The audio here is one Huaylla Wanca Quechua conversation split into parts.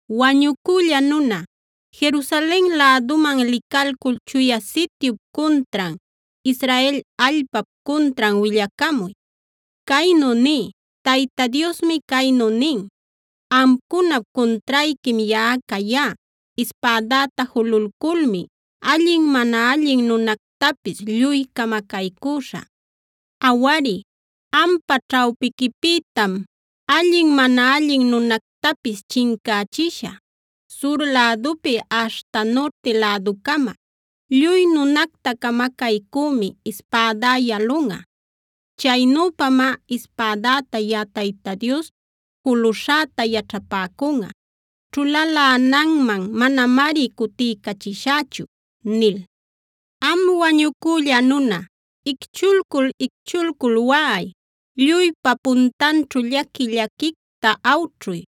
“Wañucülla nuna, Jerusalen läduman licalcul Chuya Sityup cuntran, Israel allpap cuntran willacamuy. Caynu niy: Tayta Diosmi caynu nin: Amcunap cuntrayquim yaꞌa cayá. Ispädäta jululculmi allin mana allin nunactapis lluy camacaycüśhä. Awari, ampa ćhawpiquipïtam allin mana allin nunactapis chincächishä. Sur lädupi aśhta nurti läducama lluy nunacta camacaycümi ispädá yalunꞌa. Chaynüpamá ispädäta yaꞌa Tayta Dios juluśhäta yaćhapäcunꞌa; ćhulalänanman manamari cutiycachishächu’ nil. “Am wañucülla nuna, icchulcul-icchulcul waꞌay; lluypa puntanćhu llaqui-llaquicta awćhuy.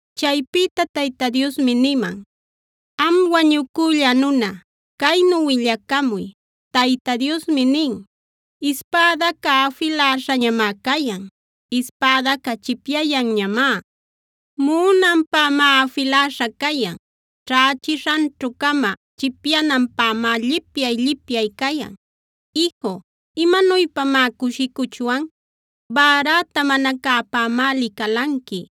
Chaypïta Tayta Diosmi niman: “Am wañucülla nuna, caynu willacamuy: ‘Tayta Diosmi nin: “ ‘Ispädaca afiläśhañamá cayan; ispädaca chipyayanñamá. Muꞌunanpämá afiläśha cayan; ćhächishanćhu-cama chipyananpämá llipyay-llipyay cayan. Iju, ¿imanuypamá cushicuchwan? Bäräta mana cäpämá licalanqui;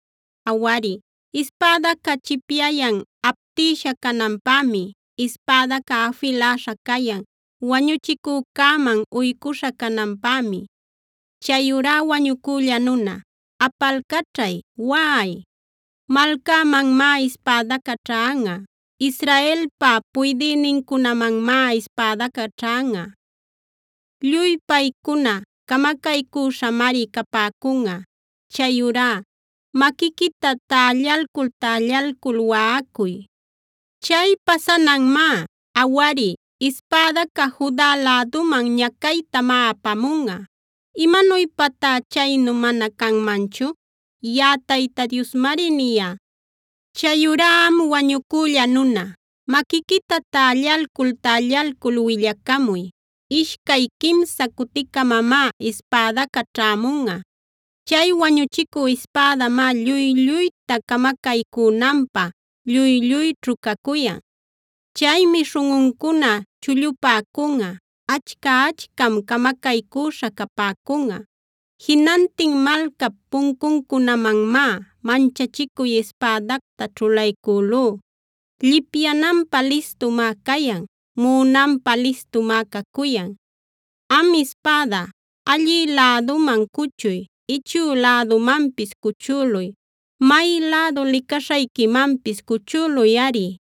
Awari, ispädaca chipyayan aptisha cananpämi. Ispädaca afiläśha cayan, wañuchicücäman uycuśha cananpämi. “ ‘Chayurá wañucülla nuna, apalcaćhay, waꞌay. Malcämanmá ispädaca ćhanꞌa; Israelpa puydïnincunamanmá ispädaca ćhanꞌa. Lluy paycuna camacaycüśhamari capäcunꞌa. Chayurá maquiquita tällalcul-tällalcul waꞌacuy. Chay pasananmá. Awari, ispädaca Juda läduman ñacaytamá apamunꞌa. ¿Imanuypatá chaynu mana canmanchu? Yaꞌa Tayta Diosmari niyá. “ ‘Chayurá am wañucülla nuna, maquiquita tällalcul-tällalcul willacamuy. Ishcay quimsa cuticamamá ispädaca ćhämunꞌa. Chay wañuchicü ispädamá lluy-lluyta camacaycünanpä lluy-lluyćhu cacuyan. Chaymi śhunꞌuncuna chullupäcunꞌa, achca-achcam camacaycüśha capäcunꞌa. Jinantin malcap puncuncunamanmá manchachicuy ispädacta ćhulaycülú. Llipyananpä listumá cayan; muꞌunanpä listumá cacuyan. Am ispäda, allï läduman cuchuy, ichü lädumanpis cuchüluy. May lädu licaśhayquimanpis cuchüluyꞌari.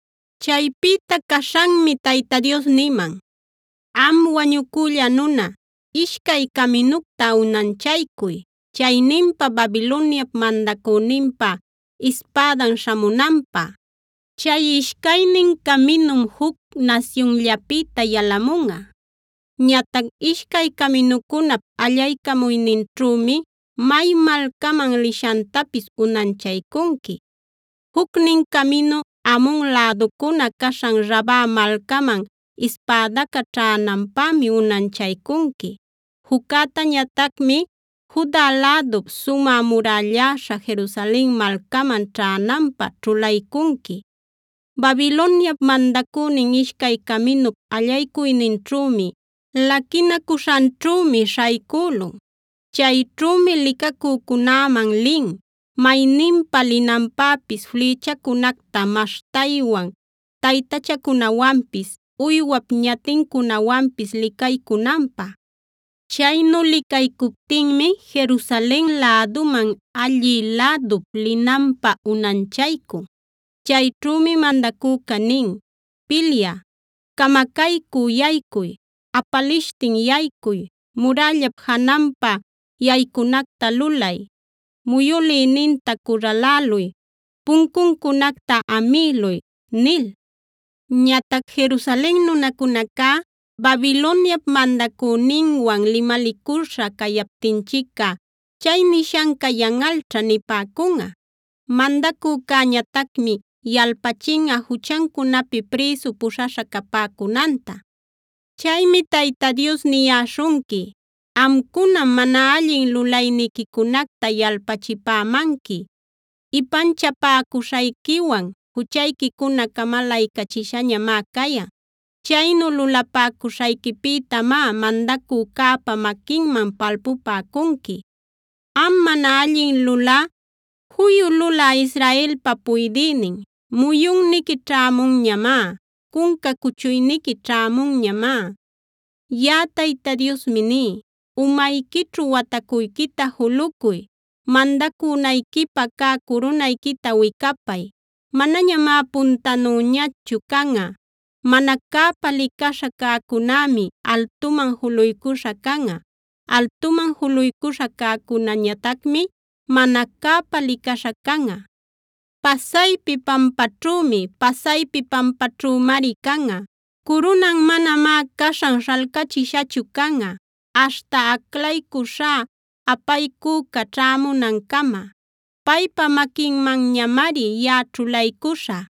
Chaypïta caśhanmi Tayta Dios niman: “Am wañucülla nuna, ishcay caminucta unanchaycuy; chayninpa Babiloniap mandacüninpa ispädan śhamunanpä. Chay ishcaynin caminum juc nasyunllapïta yalamunꞌa. Ñatac ishcay caminucunap allaycamuyninćhümi may malcaman lishantapis unanchaycunqui. Jucnin caminu Amon läducuna caśhan Raba malcaman ispädaca ćhänanpämi unanchaycunqui. Juccätañatacmi Juda lädup sumä murälläśha Jerusalen malcaman ćhänanpä ćhulaycunqui. Babiloniap mandacünin ishcay caminup allaycuyninćhümi, laquinacuśhanćhümi śhaycülun. Chayćhümi licacücunäman lin, mayninpa linanpäpis flïchacunacta maśhtaywan, taytachacunawanpis, uywap ñatincunawanpis licaycunanpä. Chaynu licaycuptinmi Jerusalen läduman allï lädup linanpä unanchaycun. Chayćhümi mandacüca nin: ‘Pilyä, camacaycü yaycuy, apalishtin yaycuy, murällap jananpa yaycunacta lulay, muyülïninta curraläluy, puncuncunacta amïluy’ nil. Ñatac Jerusalen nunacunacá: ‘Babiloniap mandacüninwan limalinacüśha cayaptinchicꞌa chay nishanca yanꞌalćha’ nipäcunꞌa. Mandacücäñatacmi yalpachinꞌa juchancunapi prïsu puśhaśha capäcunanta. “Chaymi Tayta Dios niyäśhunqui: Amcunam mana allin lulayniquicunacta yalpachipämanqui. Ipanchapäcuśhayquiwan juchayquicuna camalaycachishañamá cayan. Chaynu lulapäcuśhayquipïtamá mandacücäpa maquinman palpupäcunqui. “Am mana allin lulä, juyu lulä Israelpa puydïnin, muyunniqui ćhämunñamá; cunca cuchuyniqui ćhämunñamá. Yaꞌa Tayta Diosmi ní: umayquićhu watacuyquita julucuy, mandacunayquipä cä curunayquita wicapay. Manañamá puntanüñachu canꞌa. Mana cäpa licaśha cäcunämi altuman juluycuśha canꞌa; altuman juluycuśha cäcunäñatacmi mana cäpa licaśha canꞌa. Pasaypi pampaćhümi, pasaypi pampaćhümari canꞌa. Curunan manamá caśhan śhalcachishachu canꞌa, aśhta aclaycuśhá apaycüca ćhämunancama. Paypa maquinmanñamari yaꞌa ćhulaycuśhä.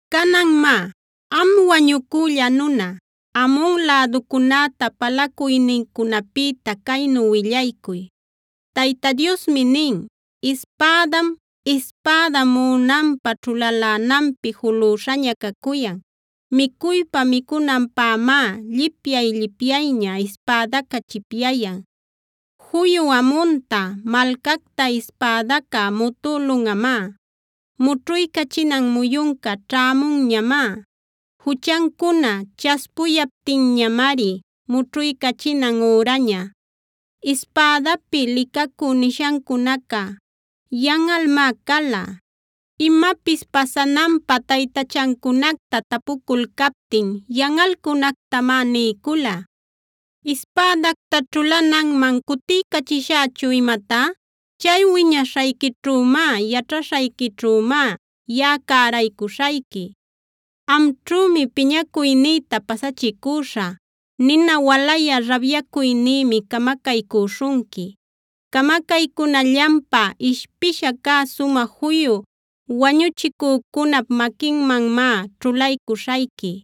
“Canan má, am wañucülla nuna, Amon läducunäta palacuynincunapïta caynu willaycuy: Tayta Diosmi nin: Ispädam, ispädam muꞌunanpä ćhulalänanpi julüśhaña cacuyan; micuypa-micunanpämá llipyay-llipyayña ispädaca chipyayan. Juyu Amonta, malcacta ispädaca mutülunꞌamá. Mućhuycachinan muyunca ćhämunñamá. Juchancuna chaspuyaptinñamari mućhuycachinan üraña. Ispädapi licacü nishancunaca yanꞌalmá cala. Imapis pasananpä taytachancunacta tapuculcaptin yanꞌalcunactamá niycula. “ ‘¿Ispädacta ćhulananman cutiycachishächun imatá? Chay wiñaśhayquićhümá, yaćhaśhayquićhümá yaꞌa cäraycuśhayqui. Amćhümi piñacuynïta pasachicüśhä; nina walayä rabyacuynïmi camacaycüśhunqui. Camacaycunallanpä ishpisha cä sumä juyu wañuchicücunap maquinmanmá ćhulaycuśhayqui.